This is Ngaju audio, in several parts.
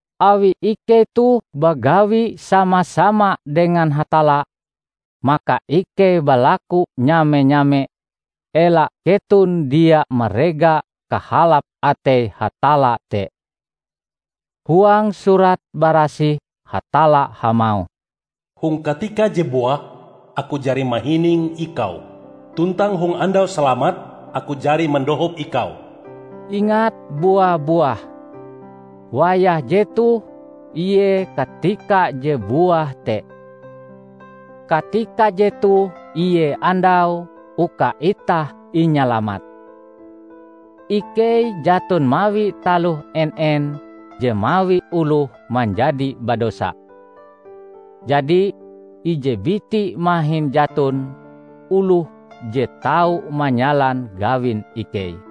Awi ikei toh bagawi sama-sama dengan Hatalla, maka ikei balaku nyame-nyame ela keton dia marega kahalap atei Hatalla te. Huang Surat Barasih Hatalla hamauh, "Hong katika je buah, aku jari mahining ikau, tuntang hong andau salamat, aku jari mandohop ikau." Ingat bua-buah! Wayah jetoh ie katika je buah te. Katika jetoh ie andaue uka itah inyalamat. Ikei jaton mawi taloh en-en je mawi oloh manjadi badosa. Jadi, ije biti mahin jaton oloh je tau manyalan gawin ikei.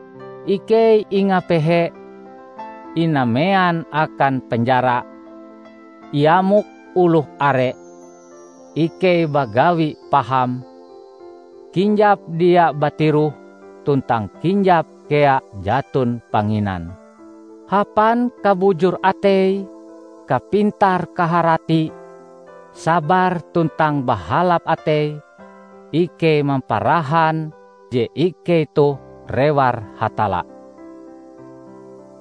ikei ingapehe, inamean akan penjara, iamok oloh are; ikei bagawi paham, kinjap dia batiroh tuntang kinjap kea jaton panginan. Hapan kabujur atei, kapintar-kaharati, sabar tuntang bahalap atei, ikei mamparahan je ikei toh rewar Hatalla.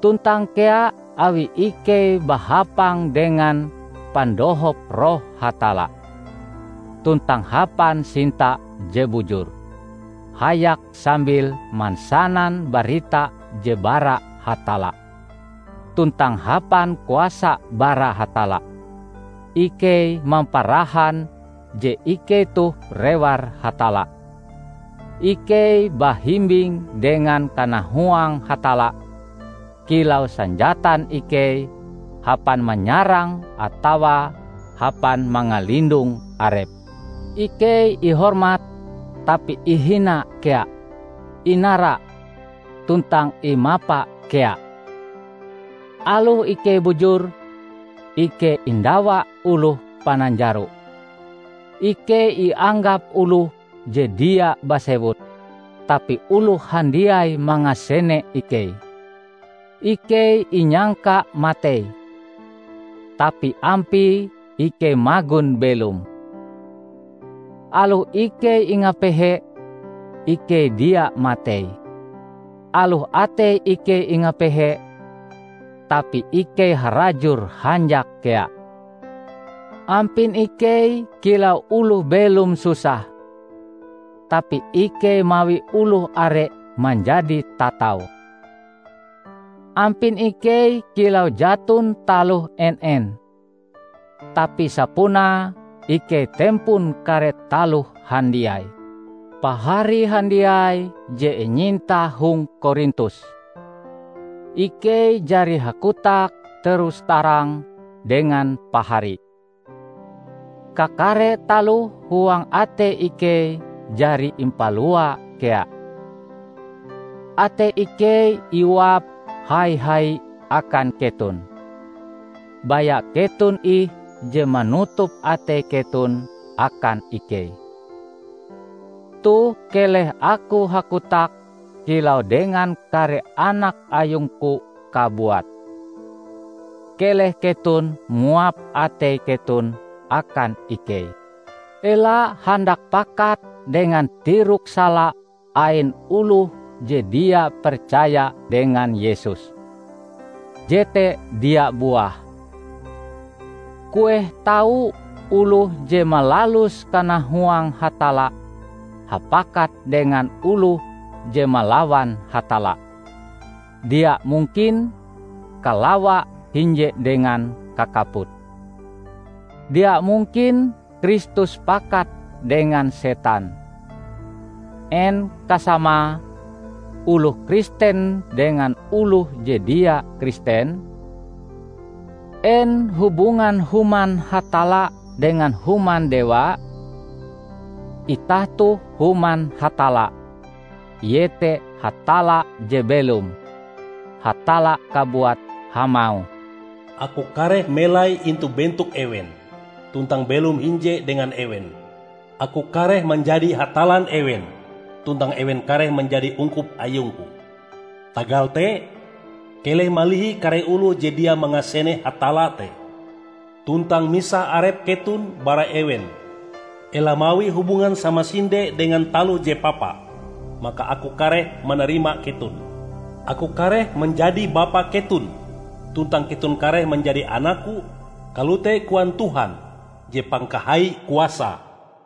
Tuntang kea awi ikei bahapang dengan pandohop Roh Hatalla, tuntang hapan sinta je bujur, hayak sambil mansanan barita je bara Hatalla, tuntang hapan kuasa bara Hatalla, ikei mamparahan je ikei toh rewar Hatalla. Ikei bahimbing dengan kanahuang Hatalla kilau sanjatan ikei hapan manyarang atawa hapan mangalindong arep. Ikei ihormat, tapi ihina kea; inara, tuntang imapa kea. Aloh ikei bujur, ikei indawa oloh pananjaro. Ikei ianggap oloh je dia basewut, tapi oloh handiai mangasene ikei. Ikei inyangka matei, tapi ampie ikei magon belom. Aloh ikei ingapehe, ikei dia matei. Aloh atei ikei ingapehe, tapi ikei harajur hanjak kea. Ampin ikei kilau oloh belom susah, tapi ikei mawi oloh are manjadi tatau. Ampin ikei kilau jaton taloh en-en, tapi sapunae ikei tempon kare taloh handiai. Pahari handiai je inyinta hong Korintus! Ikei jari hakotak terus-tarang dengan pahari. Kakare taloh huang atei ikei jari impalua kea. Atei ikei iuap hai-hai akan keton, baya keton ih je manutup atei keton akan ikei. Toh keleh aku hakotak kilau dengan kare anak ayungku kabuat. Keleh keton muap atei keton akan ikei. Ela handak pakat dengan tirok sala ain oloh je dia percaya dengan Yesus; jete dia buah. Kueh tau oloh je malalus kanahuang Hatalla hapakat dengan oloh je malawan Hatalla! Dia mungkin kalawa hinje dengan kakaput. Dia mungkin Kristus pakat dengan setan. En kasamae oloh Kristen dengan oloh je dia Kristen? En hubungan human Hatalla dengan human dewa? Itah toh human Hatalla, iete Hatalla je belom. Hatalla kabuat hamauh, "Aku kareh melai intu bentok ewen, tuntang belom hinje dengan ewen. Aku kareh manjadi Hatallan ewen, tuntang ewen kareh manjadi ungkup ayungku. Tagal te, keleh malihi kare oloh je dia mangasene Hatalla te, tuntang misah arep keton bara ewen. Ela mawi hubungan samasinde dengan taloh je papa, maka aku kareh manarima keton. Aku kareh manjadi Bapa keton, tuntang keton kareh manjadi anakku, kalote koan Tuhan je Pangkahai Kuasae."